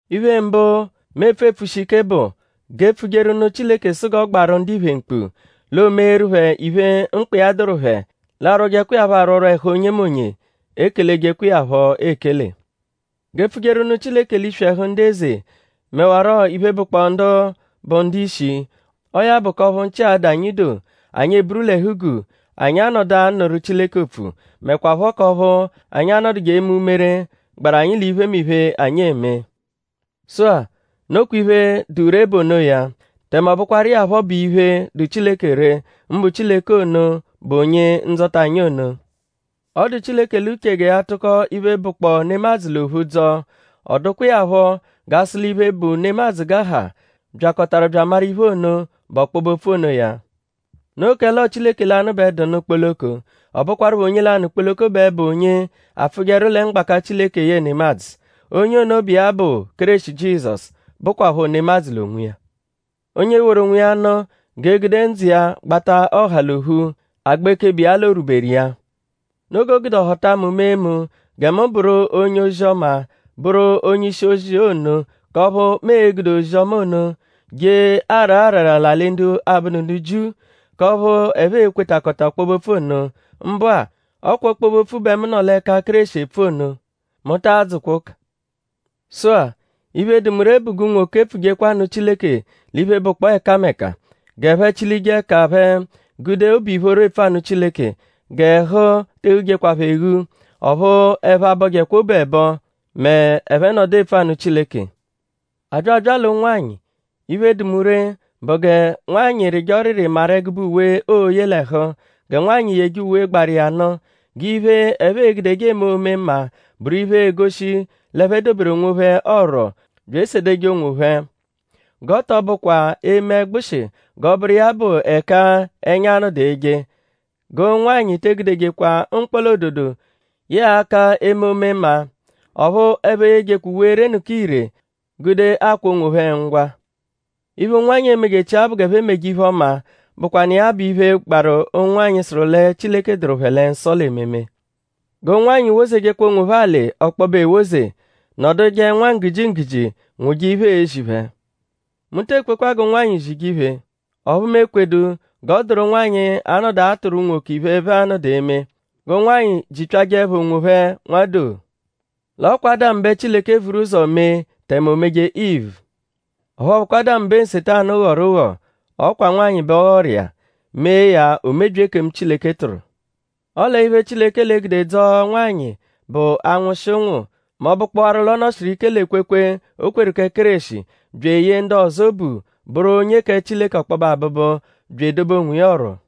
Iphe mbụ, mu epfu epfushi ike bụ; g'e pfujeru nụ Chileke sụ iya g'ọ gbaarụ ndiphe mkpu; l'o meeru phẹ iphe, mkpa iya dụru phẹ. L'a rwọjekwa iya phọ arwọrwo ẹhu onyemonye; ekelejekwa iya phọ ekele. G'e pfujeru nụ Chileke l'iswi ẹhu ndu eze; mẹwaro iphe, bụkpoo ndu bụ ndu-ishi. Ọo ya bụ k'ọphu nchị a-dụ anyi doo; anyi eburu l'ẹhu-guu; anyi a-nọdu anụru Chileke opfu; mẹkwapho k'ọphu anyi a-nọduje eme umere, gbaru anyi l'iphemiphe, anyi eme. Sụ-a; nokwa iphe, dụ ree bụ onoya. Tẹme ọ bụkwaru iya phọ bụ iphe, dụ Chileke ree; mbụ Chileke ono, bụ Onye-Ndzọta anyi ono. Ọ dụ Chileke l'uche gẹ ya tụko iphe, bụkpoo nemadzụ l'ophu dzọo. Ọ dụkwa iya phọ g'a sụ l'iphe, bụ nemadzụ g'a ha byakọtaru bya amaru iphe ono, bụ ọkpobe-opfu onoya. Noo kẹle ọo Chileke lanụ bẹ dụ nụ kpoloko; ọ bụkwarupho onye lanụ kpoloko bẹ bụ onye apfụjeru lẹ mgbaka Chileke yẹe nemadzụ. Onye ono bụ iya bụ Kéreshi Jizọsu, bụkwapho nemadzụ l'onwiya. Onye woru onwiya nụ g'e gude ndzụ iya gbata ọha l'ophu; agba ekebe iya l'orwuberu iya. Noo g'o gude ọ họta mu mee mu gẹ mu bụru onye-ozi-ọma; bụru onye-ishi-ozi ono; k'ọphu mu e-gude ozi-ọma ono je araa arara l'alị ndu abụdu ndu Jiu; k'ọphu ẹphe e-kwetakọta ọkpobe-opfu ono. Mbụa; ọ kwa ọkpobe-opfu bẹ mu nọ l'ẹka Kéreshi epfu ono. Mu ta adzụkwa ụka. Sụ-a; iphe, dụ mu ree bụ g'unwoke pfujekwa nụ Chileke l'iphe, bụkpoo ẹkameka. G'ẹphe chilije ẹka phẹ gude obu ìphóró epfu anụ Chileke. G'ẹhu te eghujekwa phẹ eghu; ọphu ẹphe abọjekwa obu ẹbo m'ẹphe nọdu epfu anụ Chileke. A bya abya l'ụnwanyi; iphe, dụ mu ree bụ gẹ nwanyị rịje ọriri maru ẹgube uwe, ooye l'ẹhu. Gẹ nwanyị yeje uwe gbaru iya nụ. G'iphe, ẹphe e-gudeje eme omemma bụru iphe, egoshi l'ẹphe doberu onwophẹ ọ̀rù bya esedeje onwophẹ. G'ọ tọ bụkwa eme ẹgbushi g'ọ bụru iya bụ ẹka ẹnya a-nọdu eje. G'ụnwanyi te egudejekwa mkpọla-ododo yẹe aka eme omemma. Ọphu ẹphe eyejekwa uwe erenụka ire gude akwa onwophẹ ngwa. Iphe, ụnwanyi emejechia bụ g'ẹphe meje iphe-ọma, bụkwanu iya bụ iphe, gbaru ụnwanyi, sụru lẹ Chileke dụru phẹ lẹ nsọ l'ememe. G'ụnwanyi wozejekwa onwophẹ alị ọkpobe ewoze; nọduje nwa nggujingguji; nwụje iphe, eezi phẹ. Mu te ekwekwa g'ụnwanyi zije iphe. Ọphu mu ekwedu g'ọ dụru nwanyị, anọdu atụru unwoke iphe, ẹphe a-nọdu eme. G'ụnwanyi jipyajẹepho onwophẹ nwadoo. L'ọ kwa Ádamu bẹ Chileke vuru ụzo mee tẹme o meje Ivu. Ọphu ọ bụkwa Ádamu bẹ Nsetanu ghọru ụgho; ọ kwa nwanyị bẹ ọ ghọru iya; mee ya o mebyia ekemu, Chileke tụru. Ọle iphe, Chileke l'e-gude dzọo nwanyị bụ anwụshi ụnwu; mẹ ọ bụkpowaru l'ọ nọ-shiru ike l'ekwekwe, o kweru kẹ Kéreshi; bya eyee ndu ọzo obu; bụru onye kẹ Chileke ọkpobe abụbu; bya edobe onwiya ọ̀rù.